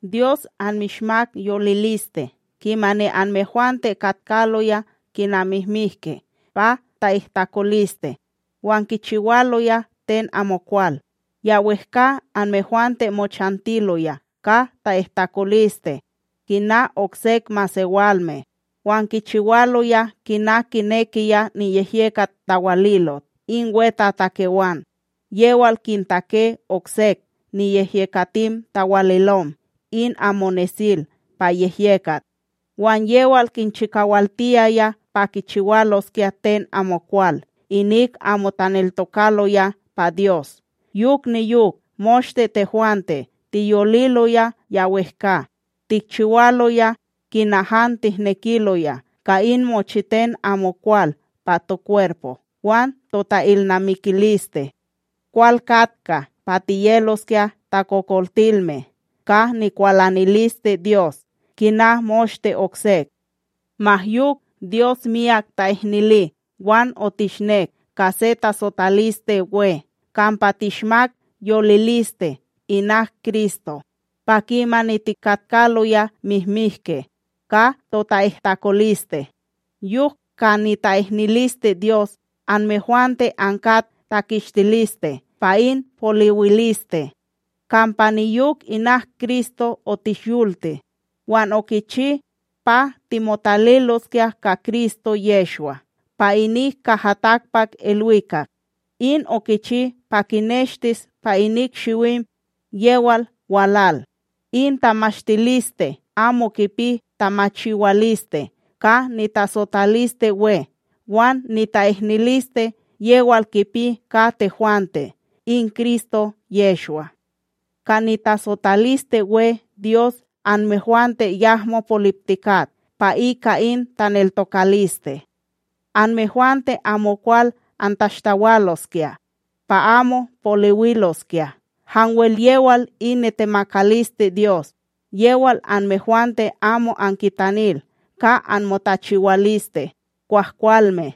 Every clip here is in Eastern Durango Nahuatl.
Dyos anmishmak yoliliste kimani anmehwante katkaloya kina mihmihke pa ta'ihtakoliste, wan kichiwaloya ten amokwal. Ya wEhka anmehwante mochantiloya ka ta'ihtakoliste kina oksek masewalme, wan kichiwaloya kina kinekiya niyehyekat tawalilot in wetatakewan yewal kintake oksek niyehyekatim tawalilom in amo nesil pa yehyekat, wan yewal kinchikawaltiyaya pa kichiwaloskya ten amokwal inik amo taneltokaloya pa Dyos. Yok niyok moshte tehwante tiyoliloya ya wehkA, tikchiwaloya kina han tihnekiloya ka in mochiten amokwal pa tokwerpo wan tota'ilnamikiliste. Kwal katka pa tiyeloskya takokoltilme ka nikwalaniliste Dyos kina moshte oksek. Ma yok, Dyos miyak ta'ihnili, wan otishnek ka se tasotaliste we, kampa tishmak yoliliste inak Kristo, pa kimani tikatkaloya mihmihke ka tota'ihtakoliste. Yok ka nita'ihniliste Dyos anmehwante ankat takistiliste pa in poliwiliste. Kampa niyok inak Kristo otishyolti, wan okichi pa timotaliloskya ka Kristo Yehshwa pa inik kaha takpakIlwikak. In okichi pa kineshtis pa inik shiwim yewal walal, in tamashtiliste amo kipi tamachiwaliste ka nitasotalisteWe wan nita'ihniliste yewal kipi ka tehwante in Kristo Yehshwa. Ka nitasotalisteWe Dyos anmehwante yahmo poliptikat pa ika in taneltokaliste. Anmehwante amokwal antashtawaloskya pa amo poliwiloskya, hanwel yewal in nitemakaliste Dyos. Yewal anmehwante amo ankitanil ka anmotachiwaliste kwahkwalme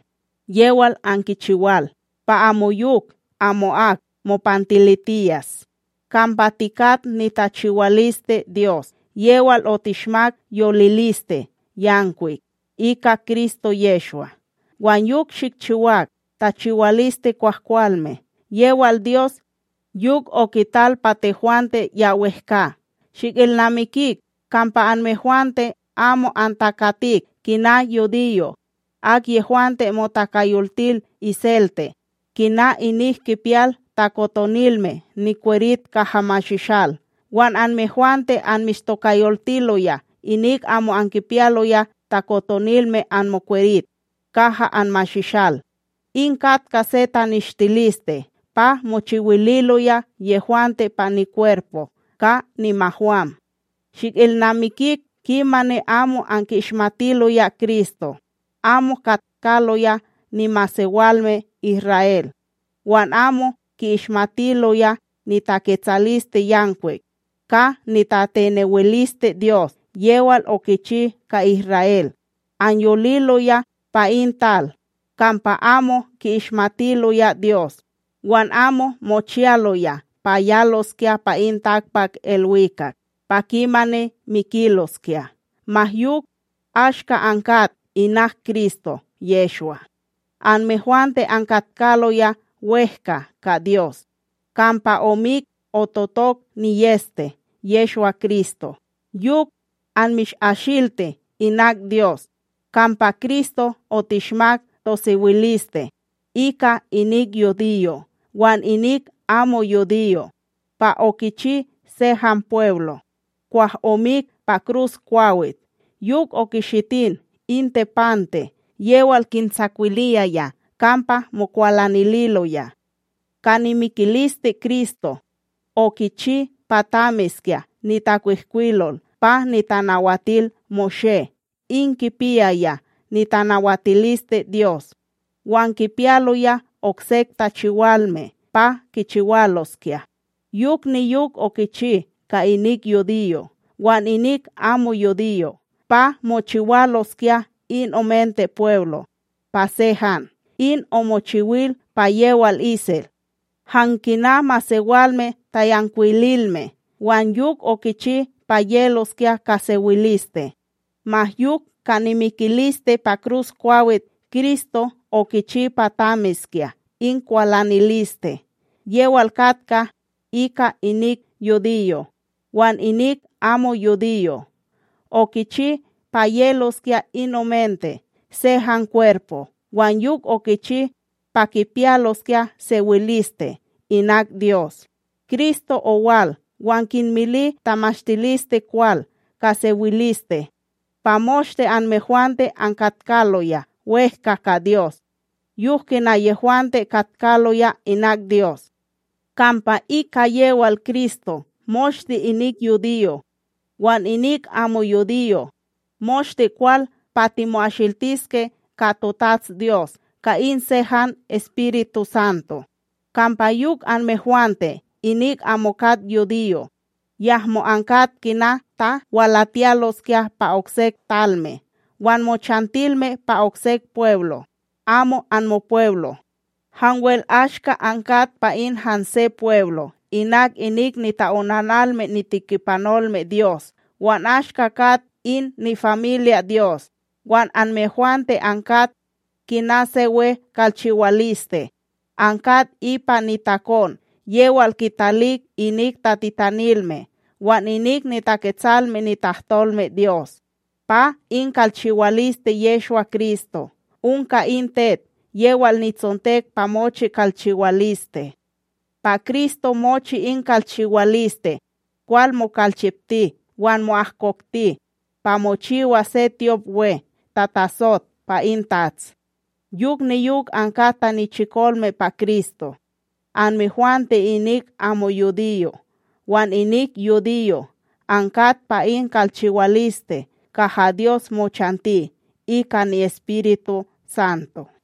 yewal ankichiwal, pa amoyok amo'ak mopantilitiyas. Kampa tikat nitachiwaliste Dyos; yewal otishmak yoliliste yankwik ika Kristo Yehshwa wan yok shikchiwak tachiwaliste kwahkwalme, yewal Dyos yok okital pa tehwante ya wehkA.Tikpiyal sewiliste ika Kristo Shikilnamikik kampa anmehwante amo antakatik kina yudiyo', akyehwante motokayoltil iselte kina inik kipiyal takotonilme nikwerit kaha mashishal wan anmehwante anmishtokayoltiloya inik amo ankipiyaloya takotonilme anmokwerit kaha anmashishal, in katka se taneshtiliste pa mochiwililoya yehwante pa nikwerpo ka nimahwam, shikilnamikik kimani amo anki'ishmatiloya Kristo, amo katkaloya nimasewalme Isra'El, wan amo ki'ishmatiloya nitaketsalisteYankwik ka nitatinewiliste Dyos yewal okichi ka Isra'El. Anyoliloya pa in tal kampa amo ki'ishmatiloya Dyos wan amo mochiyaloya pa yaloskya pa in takpakIlwikak pa kimani mikiloskya. Ma yok, ashka ankat inak Kristo Yehshwa, anmehwante ankatkaloya wEhka ka Dyos, kampa omik ototok niyEste Yehshwa-Kristo yok anmishasilti inak Dyos. Kampa Kristo otishmak tosewiliste, ika inik yudiyo' wan inik amo yudiyo' pa okichi se han pweblo, kwah omik pa kruskwawit yok okishitin in tepante yewal kintsakwiliyaya kampa mokwalanililoya. Ka nimikiliste Kristo okichi pa tamiskya nitakwihkwilol pa NitanawatilMoshé in kipiyaya nitanawatilisteDyos, wan kipiyaloya oksek tachiwalme pa kichiwaloskya; yok niyok okichi ka inik yudiyo' wan inik amo yudiyo' pa mochiwaloskya in omente pweblo' pa se han, in omochiwil pa yewal isel, han kina masewalme tayankwililme. Wan yok okichi pa yeloskya ka sewiliste. Ma yok ka nimikiliste pa kruskwawit Kristo okichi pa tamiskya in kwalaniliste, yewal katka ika inik yudiyo' wan inik amo yudiyo', okichi pa yeloskya in omente se han kwerpo wan yok okichi pa kipiyaloskya sewiliste inak Dyos. Kristo owal wan kinmili tamashtilisteKwal ka sewiliste pa moshte anmehwante ankatkaloya wehkA ka Dyos, yok kina yehwante katkaloya inak Dyos. Kampa ika yewal Kristo moshte inik yudiyo' wan inik amo yudiyo', moshte kwal pa timo'asiltiske ka toTatsDyos ka in se han EspirituSanto. Kampa yok anmehwante inik amo kat yudiyo', yahmo ankat kina ta walatiyaloskya pa oksek talme wan mochantilme pa oksek pweblo' amo anmopweblo, hanwel ashka ankat pa in hanse pweblo inak inik nita'onanalme nitekipanolme Dyos wan ashka kat in nifamilya Dyos. Wan anmehwante ankat kina se we kalchiwaliste, ankat ipa nitakon yewal kitalik inik tatitanilme wan inik niTaketsalme nitahtolmeDyos, pa in kalchiwaliste Yehshwa-Kristo onka in tet yewal nitsontek pa mochi kalchiwaliste. Pa Kristo mochi in kalchiwaliste, kwal mokalchipti wan mo'ahkokti pa mochiwas se tyopWe tatasot pa in Tats. Yok niyok ankat tanichikolme pa Kristo, anmehwante inik amo yudiyo' wan inik yudiyo' ankat pa in kalchiwaliste kaha Dyos mochanti ika ni'EspiruSanto.